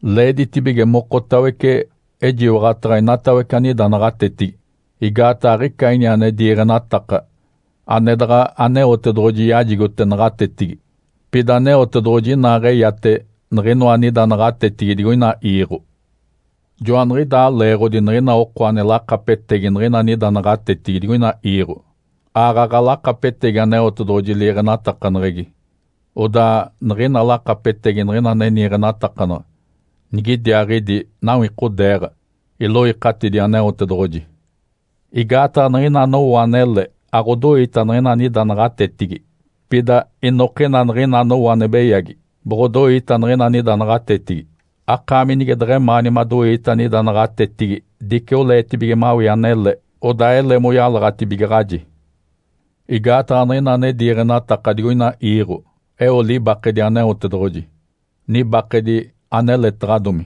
Leeditibige mokotawece ejiwaɡ̶ataɡ̶a inatawece anida naɡ̶atetigi. Igaataɡ̶a aɡ̶ica ini ane diiɡ̶enataka ane daɡ̶a Aneotedoɡ̶oji yajigote naɡ̶atetigi, pida Aneotedoɡ̶oji inaaɡ̶eyate niɡ̶inoa anida naɡ̶atetigi digoina iiɡ̶o. Joaniɡ̶idaa leeɡ̶odi niɡ̶ina oko ane lakapetegi niɡ̶ina anida naɡ̶atetigi digoina iiɡ̶o, aaɡ̶aɡ̶a lakapetegi Aneotedoɡ̶oji liiɡ̶enatakaneɡ̶egi. Odaa niɡ̶ina lakapetegi niɡ̶ina ane niiɡ̶enatakanaɡ̶a nigidiaaɡ̶idi nawikodeeɡ̶a, iloikatidi Aneotedoɡ̶oji. Igaataɡ̶a niɡ̶ina anowo anele aɡ̶odoita niɡ̶ina anida naɡ̶atetigi. Pida inokina niɡ̶ina anowo ane beyagi, boɡ̶odoita niɡ̶ina anida naɡ̶atetigi. Akaami nige deɡ̶emaani madoii anida naɡ̶atetigi, dice oleetibige mawii anele, odaa ele moyalaɡ̶atibigaɡ̶aji. Igaataɡ̶a niɡ̶ina ane diiɡ̶enataka digoina iiɡ̶o eo libakedi Aneotedoɡ̶oji, nibakedi aneletaɡ̶adomi.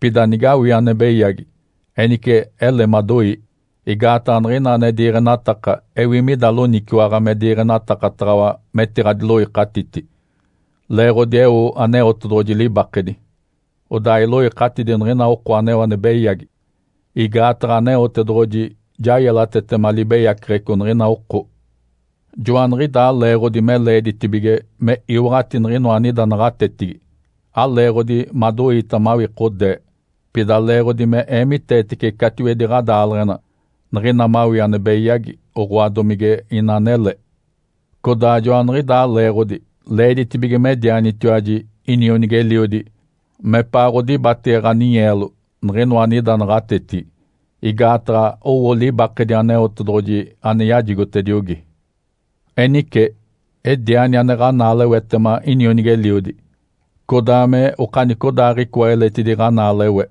Pida nigawii ane beyagi, enice ele madoii. Igaataɡ̶a niɡ̶ina ane diiɡ̶enataka ewi mida loniciwaɡ̶a me diiɡ̶enatakataɡ̶awa metiɡ̶adiloikatiti. Leeɡ̶odi eo Aneotedoɡ̶oji libakedi, odaa iloikatidi niɡ̶ina oko aneo ane beyagi, igaataɡ̶a Aneotedoɡ̶oji ja yelatetema libeyaceɡ̶eco niɡ̶ina oko. Joaniɡ̶idaa leeɡ̶odi me leeditibige me iwaɡ̶ati niɡ̶inoa anida naɡ̶atetigi, aleeɡ̶odi madoiita mawikodee, pida leeɡ̶odi me eemiteetece catiwedi ɡ̶adaaleɡ̶ena niɡ̶ina mawii ane beyagi, oɡ̶oa, domige ina anele. Codaa joaniɡ̶idaa leeɡ̶odi leeditibige medianitiwaji inionigi-eliodi mepaaɡ̶odibatege ɡ̶aninyeelo niɡ̶inoa anida naɡ̶atetigi, igaataɡ̶a owo libakedi Aneotedoɡ̶oji ane yajigotediogi. Enice ediani ane ɡ̶anaalewetema inionigi-eliodi, codaa me okanicodaaɡ̶icoa eletidi ɡ̶anaalewe.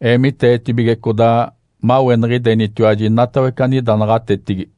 Eemiteetibige codaa maweniɡ̶idenitiwaji inatawece anida naɡ̶atetigi.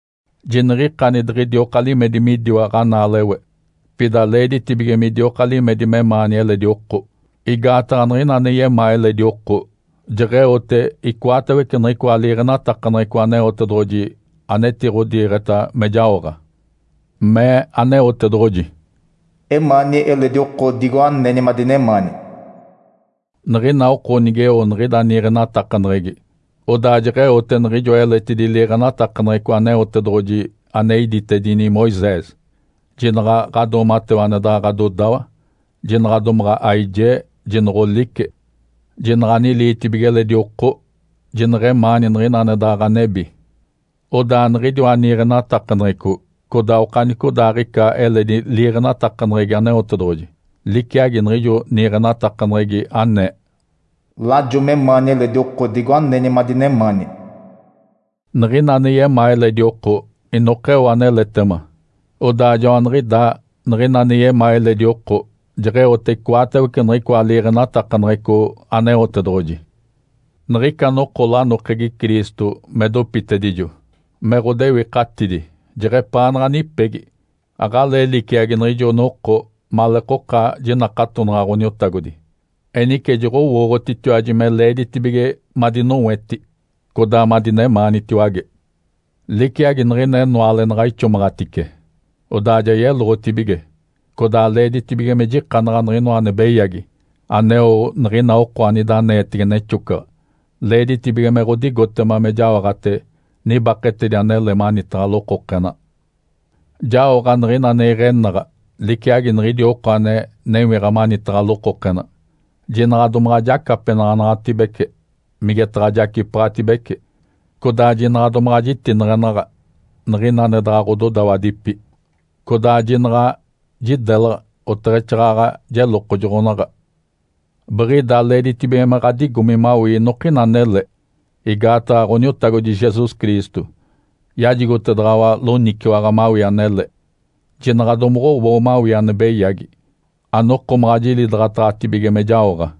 Jiniɡ̶ikani diɡ̶idioka limedi midiwa ɡ̶anaalewe. Pida leeditibige midioka limedi memaani eledi oko. Igaataɡ̶a niɡ̶ina ane yemaa eledi oko, jeɡ̶eote icoatawece niɡ̶icoa liiɡ̶enatakaneɡ̶eco Aneotedoɡ̶oji anetiɡ̶odiiɡ̶eta me jaoɡ̶a. Mee Aneotedoɡ̶oji, “Emaani eledi oko digo aneni madinemaani.” Niɡ̶ina oko nigeo niɡ̶ida niiɡ̶enatakaneɡ̶egi, odaa jeɡ̶eote niɡ̶ijoa eletidi liiɡ̶enatakaneɡ̶eco Aneotedoɡ̶oji ane iditedini Moisés, “Jinaɡ̶a ɡ̶adoomatewa ane daɡ̶a ɡ̶adodawa. Jinaɡ̶a domaɡ̶a aijee. Jinoɡ̶olice. Jinaɡ̶a aniliitibige eledi oko. Jineɡ̶emaani niɡ̶ina ane daɡ̶a ɡ̶anebi.” Odaa niɡ̶idiwa niiɡ̶enatakaneɡ̶eco codaa okanicodaaɡ̶ica eledi liiɡ̶enatakaneɡ̶egi Aneotedoɡ̶oji liciagi niɡ̶ijo niiɡ̶enatakaneɡ̶egi anee, “Lajo memaani eledi oko digo aneni madinemaani.” Niɡ̶ina ane yemaa eledi oko inokeo aneletema. Odaa joaniɡ̶idaa niɡ̶ina ane yemaa eledi oko jeɡ̶eote icoatawece niɡ̶icoa liiɡ̶enatakaneɡ̶eco Aneotedoɡ̶oji. Niɡ̶ica noko lanokegi Cristo me dopitedijo me ɡ̶odewikatidi jeɡ̶epaanaɡ̶a nipegi, aɡ̶alee liciagi niɡ̶ijo noko maleekoka jinakatonaɡ̶a Ǥoniotagodi. Enice, joɡ̶owooɡ̶otitiwaji me leeditibige madinoweti, codaa madinemaanitiwage. Liciagi niɡ̶ina enoale naɡ̶a ixomaɡ̶atice, odaa ja yeloɡ̶otibige, Codaa leeditibige me jikanaɡ̶a niɡ̶inoa ane beyagi aneo niɡ̶ina oko anida aneetege nexocaɡ̶a. Leeditibige me ɡ̶odigotema me jaoɡ̶ate nibaketedi anele manitaɡ̶a lokokena. Jaoɡ̶a niɡ̶ina ane iɡ̶enaɡ̶a liciagi niɡ̶idi oko ane newiɡ̶a manitaɡ̶a lokokena. Jinaɡ̶a domaɡ̶a jacapenaɡ̶anaɡ̶atibece migetaɡ̶a jacipaɡ̶atibece; codaa jinaɡ̶a domaɡ̶a jitineɡ̶enaɡ̶a niɡ̶ina ane daɡ̶a ɡ̶ododawadipi; codaa jinaɡ̶a jidelaɡ̶a oteɡ̶exaaɡ̶aɡ̶a jelokojoɡ̶onaɡ̶a. Biɡ̶ida leeditibige me ɡ̶adigomi mawii inokina anele, igaataɡ̶a Ǥoniotagodi Jesus Cristo yajigotedaɡ̶awa loniciwaɡ̶a mawii anele. Jinaɡ̶a domoɡ̶owoo mawii ane beyagi, anokomaɡ̶a jilidaɡ̶ataɡ̶atibige me jaoɡ̶a.